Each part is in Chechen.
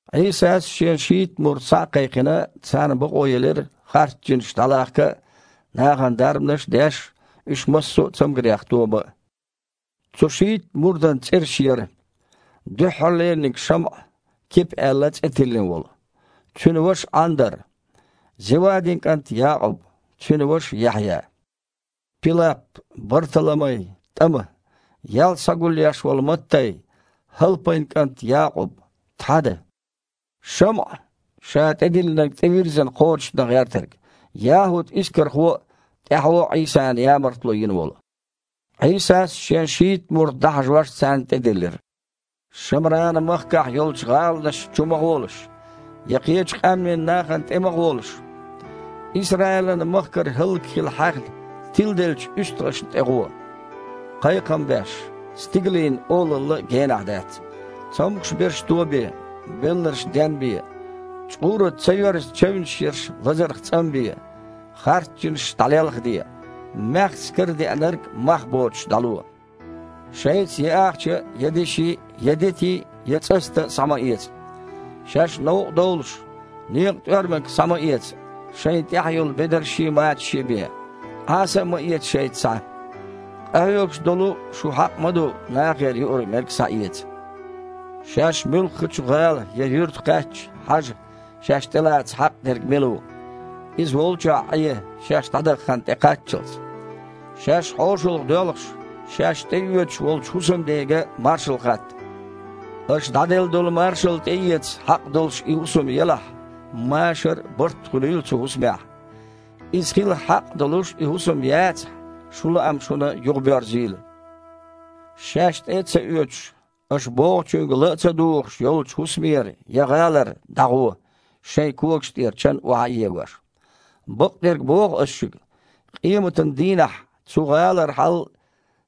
Іийсас, Шен шийтта мурд схьа а кхайкхина, царна бакъо елира харц жинаш дІалахка а, нахана дарбанаш а деш, уьш массо а цамгарех тобан а. Цу шийтта мурдан цІераш яра: дуьххьарлераниг – ШамІа, Кипа аьлла цІе тиллина волу. Цуьнан ваша Іандар, Зевадин кІант Якъуб, цуьнан ваша Яхьъя, Пилап, Барталамай, ТІама, ял схьагулъеш волу Маттай, ХІалпайн кІант Якъуб, Тхьада, ШамІа (ша тІелаьцнарг тІевирззина кхочушдан гІертарг), ЯхІуд-Искархо а, тІаьхьо Іийсана ямартло йина волу. Іийсас, Шен шийтта мурд дІахьажош, царна тІедиллира: «Шамранан махкахь йолчу гІаланашна чу ма гІолаш, я кхечу къаьмнийн нахана тІе а ма гІолаш. Исраилан махкара хІаллакьхила хьаьхна, тиладеллачу уьстагІашна тІе гІо, кхайкхам беш: „Стигалийн Олалла генахь дац“. Цомгуш берш тобе, белларш денбе, чкъураца ца йоьрзу чевнаш ерш лазарх цІанбе, харц жинаш дІалелхаде. Маьхза карадеанарг мах боцуш дІало. Шайца я ахча а, я деши а, я дети а, я цІаста а схьа ма эца. Шаьш новкъа довлуш, некъан тІоьрмаг а схьа ма эца, шайна тІехь йолу бедаршший, мачашший бен. Іаса а ма эца шайца схьа. Къахьоьгуш долу шу хьакъ ма ду нахера юург-мерг схьаэца. Шаьш муьлххачу гІала я юьрта кхаьчча, хьажа, шаьш тІелаца хьакъ дерг мила ву. Иза волчохь Іе, шаьш дІадаха хан тІекхаччалц. Шаьш хьошалгІа доьлхуш, шаьш тІеоьцуш волчу хІусамдега маршалла хатта. Аша дІаделла долу маршалла тІеэца хьакъ долуш и хІусам елахь, машар а, барт а хуьлийла цу хІусамехь. Иза хила хьакъ долуш и хІусам яцахь, шун лаам шуна юхабоьрзийла. Шаьш тІе а ца оьцуш, аша бохучуьнга ла а ца дугІуш йолчу хІусамера я гІалара дІагІо, шайн когаш тІера чан охьа а егош. Бакъдерг боху Аса шуьга: къематан дийнахь цу гІалара хьал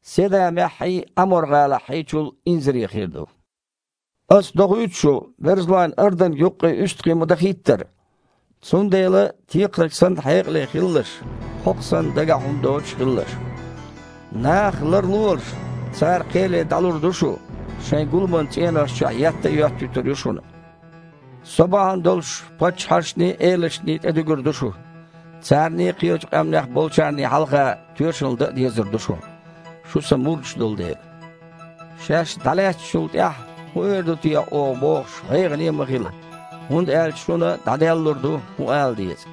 Седамеххьий, Іамор-гІалаххьий чул инзаре хир ду». «Аса дохуьйту шу, берзалойн арданг юккъе уьстагІий ма-дахийттара. Цундела, текхарг санна, хьекъале хилалаш, кхокха санна, дагахь хІума доцуш а хилалаш. Нахах ларлолаш, цара кхеле дІалур ду шу, шайн гуламан цІенош чохь етта а йоьттуьйтур ю шуна. Со бахьана долуш паччахьашний, элашний тІе а дуьгур ду шу. Царний, кхечу къаьмнех болчарний хьалха тоьшалла дан а дезар ду шун, шу Сан мурдаш болу дела. Шаьш дІалаьцначул тІаьхьа, хІун эр ду техьа оха бохуш, гІайгІане а ма хила, хІунда аьлча шуна дІаделлалур ду, хІун ала деза.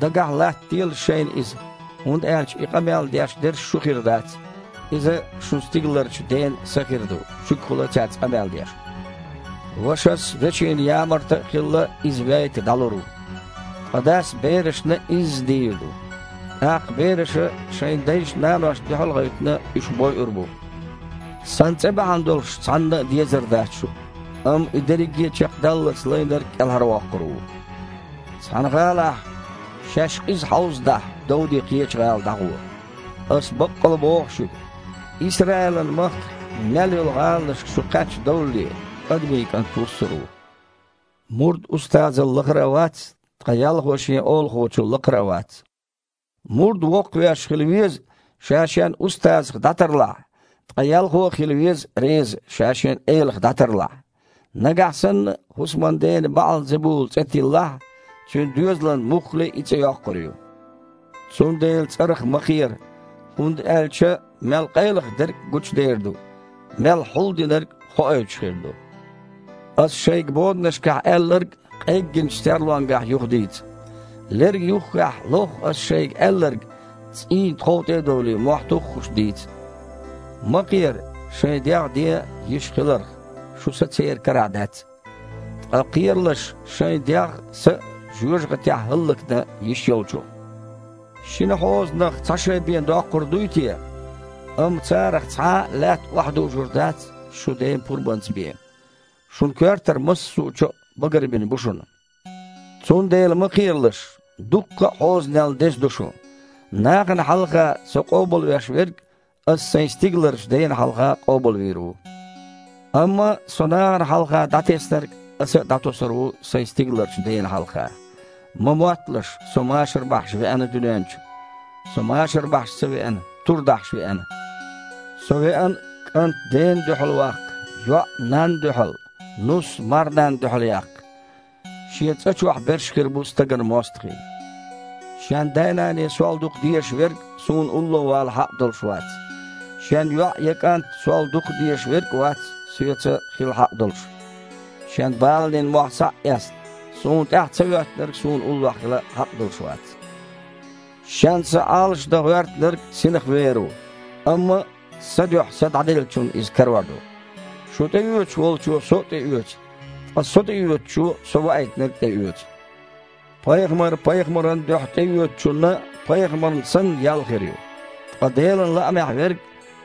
Дагахь латтаделаш шайна иза, хІунда аьлча и къамел деш дерш шу хир дац, иза шун стигаларчу Ден Са хир ду шуьгахула цаьрца къамел деш. Вашас, вешина ямарта а хилла, иза вейта дІалур ву. Ткъа дас берашна а изза дийр ду. ТІаккха бераша, шайн дайшна-наношна дуьхьал а гІевттина, уьш бойур а бу. Сан цІе бахьана долуш цхьанна а дезар дац шу, амма и дерриге а чекхдаллалц лайнарг кІелхьарвоккхур ву. Цхьана гІалахь шаьш къиза хьовзадахь, довдий, кхечу гІала дІагІо. Аса баккъал боху шуьга: Исраилан махкахь мел йолу гІаланашка шу кхаьчна довлале, Адамийн КІант вуссур ву». «Мурд устазал лахара а вац, ткъа ялхо шен олахочул лакхара а вац. Мурд воккхавеш хила веза, ша шен устазах дІатарлахь, ткъа ялхо а хила веза реза, ша шен элах дІатарлахь. Нагахь санна хІусаман дена БаІал-Зебула цІе тиллахь, цуьнан доьзалан муххале а и цІе йоккхур ю. Цундела царах ма кхера, хІунда аьлча мел къайлаха дерг а гучудер ду, мел хьулдинарг а хоуьйтуш хир ду. Аса шайга боданашкахь аьлларг а къеггинчу серлонгахь юхадийца. Лерга юххехь лохха Аса шайга аьлларг, цІийнан тхов тІе а довлий, мохь туххуш дийца. Ма кхера шайн дегІ ден йиш хиларх, шун са церан карахь дац. Ткъа кхералаш шайн дегІ а, са а жоьжахатехь хІаллакдан йиш Йолчунах. Шина хьозанах цхьа шай бен доккхур дуй те? Амма царах цхьа а лаьтта охьадужур дац шун Ден пурбанца бен. Шун коьртара массо чо а багарбина бу шуна! Цундела ма кхералаш: дуккха а хьозанел деза ду шу! Нахана хьалха Со къобалвеш верг Аса Сайн стигаларчу Дена хьалха къобалвийр ву. Амма Со нахана хьалха дІатеснарг Аса а дІатосур ву Сайн стигаларчу Дена хьалха». «Ма мотталаш Со машар бахьаш веана дуьнен чу. Со машар бахьаш ца веана, тур дахьаш веана. Со веана „кІант дена дуьхьал ваккха, йоІ – нанна дуьхьал, нус – марнанна дуьхьал яккха. Шен цІа чохь берш хир бу стагана мостагІий“. Шен дай-наний Сол дукха дезаш верг Суна улло вала хьакъ долуш вац. Шен йоІ я кІант Сол дукхах дезаш верг а вац Соьца хила хьакъ долуш. Шен баланийн мохь схьа а эцна, Суна тІаьхьа ца хІоьттинарг Суна уллохь хила хьакъ долуш вац. Шен са Іалашдан гІоьртинарг синах вер ву, амма Сан дуьхьа са дІаделлачунна иза карор ду. Шу тІеоьцуш волчо Со а тІеоьцу, ткъа Со тІеоьцучо Со Ваийтинарг а тІеоьцу. Пайхамар пайхамаран дуьхьа тІеоьцучунна, пайхамарна санна, ял хир ю, ткъа Делан лаамехь верг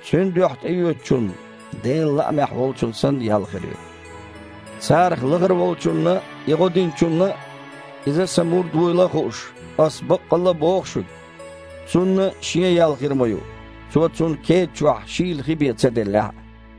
Цуьнан дуьхьа тІеоьцучунна, Делан лаамехь волчунна санна, ял хир ю. Царах лахара волчунна а гІо диначунна, иза Сан мурд вуйла а хууш, Аса баккъалла а боху шуьга, цунна шен ял хир ма ю, цо цунна кеда чохь шийла хи бен ца деллехь а».